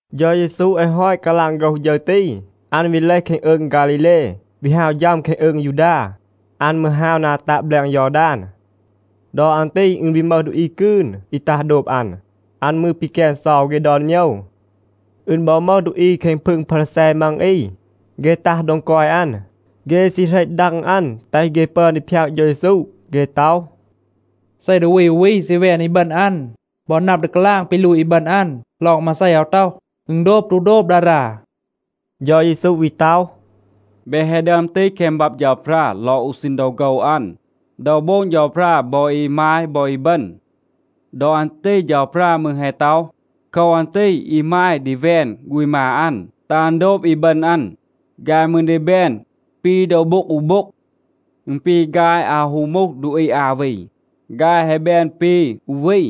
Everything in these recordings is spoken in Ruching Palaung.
เฌา เยซู แฮะ ฮอต กาลาง โฆรห ฌึร ตี, อัน วี เลห แคง อืง ฆาลีเล, วี ฮาว ฌัม แคง อืง ยูดา. อัน มืร ฮาว นา ตัะ แบลง ยอดาน. ดอ อัน ตี อึณ วี มึห ดูอี กืน อี ตัห โดบ อัน. อัน มืร ปีแกน เซา เฆ ดอน โมยว. อึณ บอ มึห ดูอี แคง พึง พารีแซ มัง อี, เฆ ตัห โดง กอย อัน. เฆ ซี เหรต ดัง อัน, แตห เฆ ปึอน ดี พยาก เฌา เยซู. เฆ ต็อห, “เซ ดูอี อู วี ซี แวน อีบึณ อัน, บอ นับ ดี กาลาง ปี ลูต อีบึณ อัน ลอง มาเซ อาว ต็อห, อึณ โดบ ตู โดบ ดารา?” เฌา เยซู วี ต็อห, “เบ แฮะ ดึอม ตีห แคง บับ เฌาพรา ลอง อู ซีณ ดอ โฆว อัน, ดอ โบง เฌาพรา บอ อีมาย บอ อีบึณ. ดอ อัน ตี เฌาพรา มืร แฮะ ต็อห, ‘โคว อัน ตี อีมาย ดี แวน ฆูณ มา อัน, แตห อัน โดบ อีบึณ อัน. ฆาย มืร ดี แบน ปี โดว โบ็ง อู โบ็ง.’ อึณ ปี ฆาย อาว ฮู มูห ดูอี อา วี. ฆาย แฮะ แบน ปี อู วี.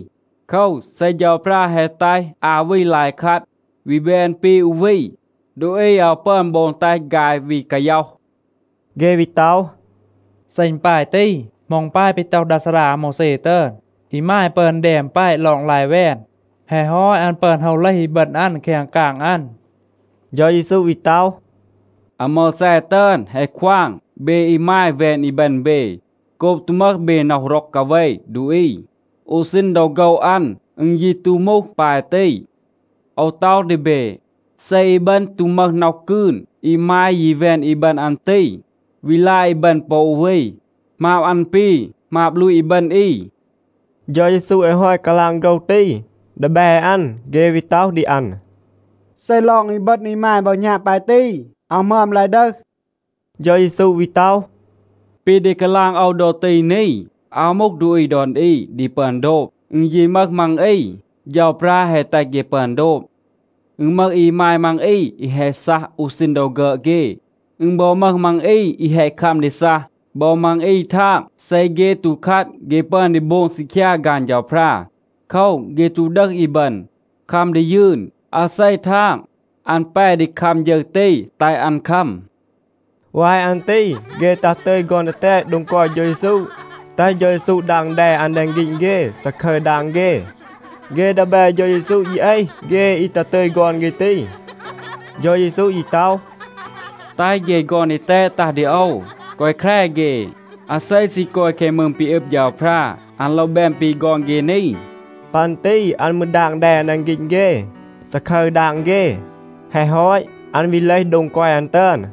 โคว, เซ เฌาพรา แฮะ แตห อา วี ลาย คัด, วี แบน ปี อู วี, ดูอี อาว ปึอน โบง แตห ฆาย วี กาย็อห.” เฆ วี ต็อห, “เซ อึณ ปาย ตี, เหมา อึณ ปาย ปี ต็อห ดา ซารา อาโมวแซ ตึอน, อีมาย ปึอน แดม แปะ ลอง ลาย แวน? แฮะ ฮอต อัน ปึอน โฮว เลห อีบึณ อัน แคง กาง อัน.” เฌา เยซู วี ต็อห, “อาโมวแซ ตึอน แฮะ ควาง เบ อีมาย แวน อีบึณ เบ, โกบ ตู มึห เบ น็อห ร็อก กาเว ดูอี. อู ซีณ ดอ โฆว อัน อึณ ยี ตู มูห ปาย ตี. โอว ต็อห ดี เบ, เซ อีบึณ ตู มึห น็อห กืน, อีมาย ยี แวน อีบึณ อัน ตี, วี ลาย อีบึณ ปอ อู วี, หมาบ อัน ปี หมาบ ลูต อีบึณ อี.” เฌา เยซู แฮะ ฮอต กาลาง โฆรห ตี, ดีแบ อัน, เฆ วี ต็อห ดี อัน, “เซ ลอง อีบึณ อีมาย บอ หณาบ ปาย ตี, อาว หมึอม ลาย ดึห.” เฌา เยซู วี ต็อห, “ปี ดี กาลาง โอว ดอ ตี นี, อาว มูห ดูอี ดอน อี ดี ปึอน โดบ. อึณ ยี มึห มัง อี, เฌาพรา แฮะ แตห เฆ ปึอน โดบ. อึณ มึห อีมาย มัง อี อี แฮะ ซัห อู ซีณ ดอ ฆึอด เฆ. อึณ บอ มึห มัง อี อี แฮะ คัม ดี ซัห. ปอ มัง อี ทาง, เซ เฆ ตู คัด, เฆ ปึอน ดี โบง ซีคยา ฆาน เฌาพรา. โคว, เฆ ตู ดึห อีบึณ, คัม ดี ยืน. อาเซ ทาง, อัน แป ดี คัม ฌึร ตี, แตห อัน คัม.” วาย อัน ตี เฆ ตัห ตึย ฆอน ดีแตด โดง กอย เฌา เยซู, แตห เฌา เยซู ดาง แด อัน แดง ฆีณ เฆ, ซาคึร ดาง เฆ. เฆ ดีแบ เฌา เยซู ยี เอห เฆ อี ตัห ตึย ฆอน เฆ ตี. เฌา เยซู ยี ต็อห, “แตห เฆ ฆอน ดีแตด ตัห ดี โอว. แกวะ แคร เฆ. อาเซ ซี กอย แคง มืง ปี อึบ เฌาพรา, อัน โลว แบน ปี ฆอน เฆ นี.” ปัน ตี อัน มืร ดาง แด อัน แดง ฆีณ เฆ, ซาคึร ดาง เฆ. แฮะ ฮอต, อัน วี เลห โดง กอย อัน ตึอน.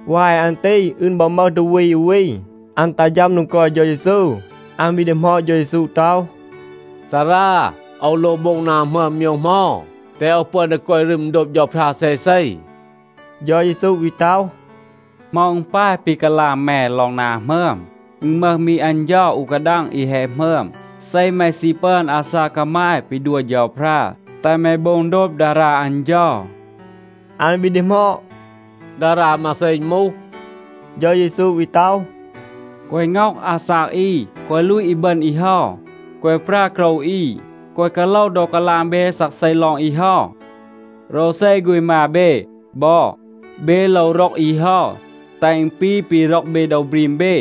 วาย อัน ตี อึณ บอ มึห ดูอี อู วี, อัน ตัห ฌัม โดง กอย เฌา เยซู. อัน วี ดีหมอด เฌา เยซู ต็อห, “ซารา, โอว โลว โบง นา หมึอม โมยว เหมา, แตห โอว ปึอน ดี กอย รึม โดบ เฌาพรา เซเซ?” เฌา เยซู วี ต็อห, “เหมา อึณ ปาย ปี กาลาง แม ลอง นา หมึอม? อึณ มึห มี อัน เฌา อู กาดัง อี แฮะ หมึอม. เซ แม ซี ปึอน อาซาก กามาย ปี ดัว เฌาพรา, แตห แม โบง โดบ ดารา อัน เฌา.” อัน วี ดีหมอด, “ดารา มาเซ อึณ มูห?” เฌา เยซู วี ต็อห, “แกวะ ง็อห อาซาก อี, แกวะ ลูต อีบึณ อี เฮา, แกวะ ปรา โกรว อี, แกวะ กาโลว ดอ กาลาง เบ ซักเซ ลอง อี เฮา, โรวเซ ฆูณ มา เบ บอ, เบ โลว ร็อก อี เฮา, แตห อึณ ปี ปี ร็อก เบ โดว บรีม เบ.”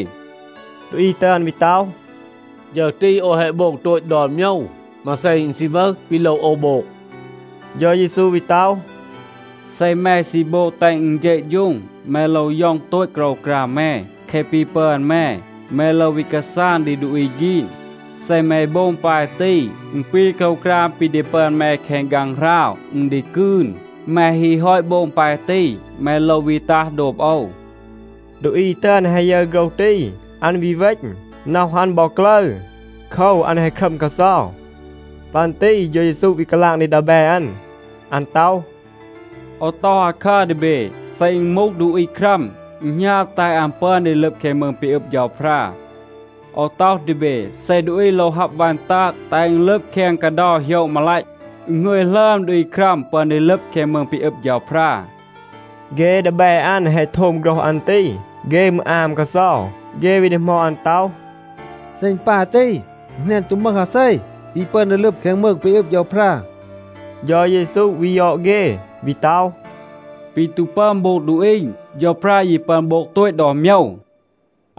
ดูอี ตึอน วี ต็อห, “ฌึร ตี โอว แฮะ โบง โตต ดอน โมยว. มาเซ อึณ ซี มึห, ปี โลว โอว โบง?” เฌา เยซู วี ต็อห, “เซ แม ซี โบง แตห อึณ เฌะฌูง, แม โลว ย็อง โตต โกรวกราม แม. แคะ ปี ปึอน แม, แม โลว วี กาซาง ดี ดูอี ฆีน. เซ แม โบง ปาย ตี, อึณ ปี โกรวกราม ปี ดี ปึอน แม แคง ฆางหราว, อึณ ดี กืน. แม ฮี ฮอต โบง ปาย ตี, แม โลว วี ตัห, โดบ โอว.” ดูอี ตึอน แฮะ ยึร โฆรห ตี, อัน วี เวณ. น็อห อัน บอ กลึร. โคว, อัน แฮะ ครัม กาเซา. ปัน ตี เฌา เยซู วี กาลาง ดี ดีแบ อัน. อัน ต็อห, “โอว ต็อห อาคัร ดี เบ, เซ อึณ มูห ดูอี ครัม, อึณ หณาบ, แตห อัน ปึอน ดี ลึบ แคง มืง ปี อึบ เฌาพรา. โอว ต็อห ดี เบ, เซ ดูอี โลว ฮับ วัน ตาง,a แตห อึณ ลึบ แคง กาเดา โหยะ มาลัต, อึณ หงึย หลึอม ดูอี ครัม ปึอน ดี ลึบ แคง มืง ปี อึบ เฌาพรา.” เฆ ดีแบ อัน แฮะ โทม โฆรห อัน ตี, เฆ มืร อาม กาเซา. เฆ วี ดีหมอด อัน ต็อห, “เซ อึณ ปาย ตี, อึณ แหนน ตู มึห อาเซ อี ปึอน ดี ลึบ แคง มืง ปี อึบ เฌาพรา.” เฌา เยซู วี ยอด เฆ, วี ต็อห, “ปี ตู ปึอน โบง ดูอี, เฌาพรา ยี ปึอน โบง โตต ดอน โมยว.”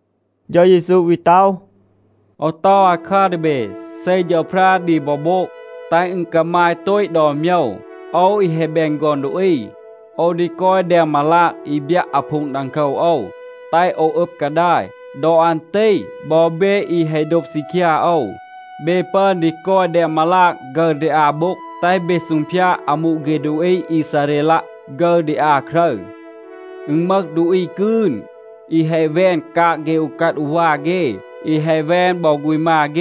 เฌา เยซู วี ต็อห, “โอว ต็อห อาคัร ดี เบ. เซ เฌาพรา ดี บอ โบง แตห อึณ กามาย โตต ดอน โมยว, โอว อี แฮะ แบน ฆอน ดูอี, โอว ดี กอย แดง มาลาง อี บยัะ อาพูง ดังโคว โอว, แตห โอว อึบ กาดาย. ดอ อัน ตี บอ เบ อี แฮะ โดบ ซีคยา โอว, เบ ปึอน ดี กอย แดง มาลาง ฆึร ดี อา โบ็ง, แตห เบ ซูงพยาด อามู เฆ ดูอี อีซาเรลัะ ฆึร ดี อา ครึร. อึณ มึห ดูอี กืน, อี แฮะ แวน กาง เฆ อูกัด อูวา เฆ, อี แฮะ แวน บอ ฆูณ มา เฆ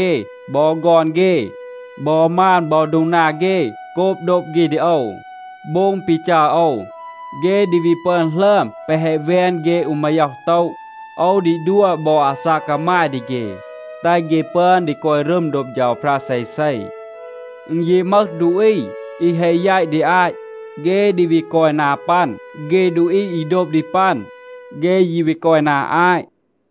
บอ ฆอน เฆ บอ มาน บอ โดง นา เฆ โกบ โดบ เฆ ดี โอว, โบง ปี จัร โอว. เฆ ดี วี ปึอน หลึอม แปะ แฮะ แวน เฆ อู มาย็อห บูน. โอว ดี ดัว บอ อาซาก กามาย ดี เฆ, แตห เฆ ปึอน ดี กอย รึม โดบ เฌาพรา เซเซ. อึณ ยี มึห ดูอี อี แฮะ แยต ดี อาต, เฆ ดี วี กอย นา ปัน. เฆ ดูอี อี โดบ ดี ปัน, เฆ ยี วี กอย นา อาต.”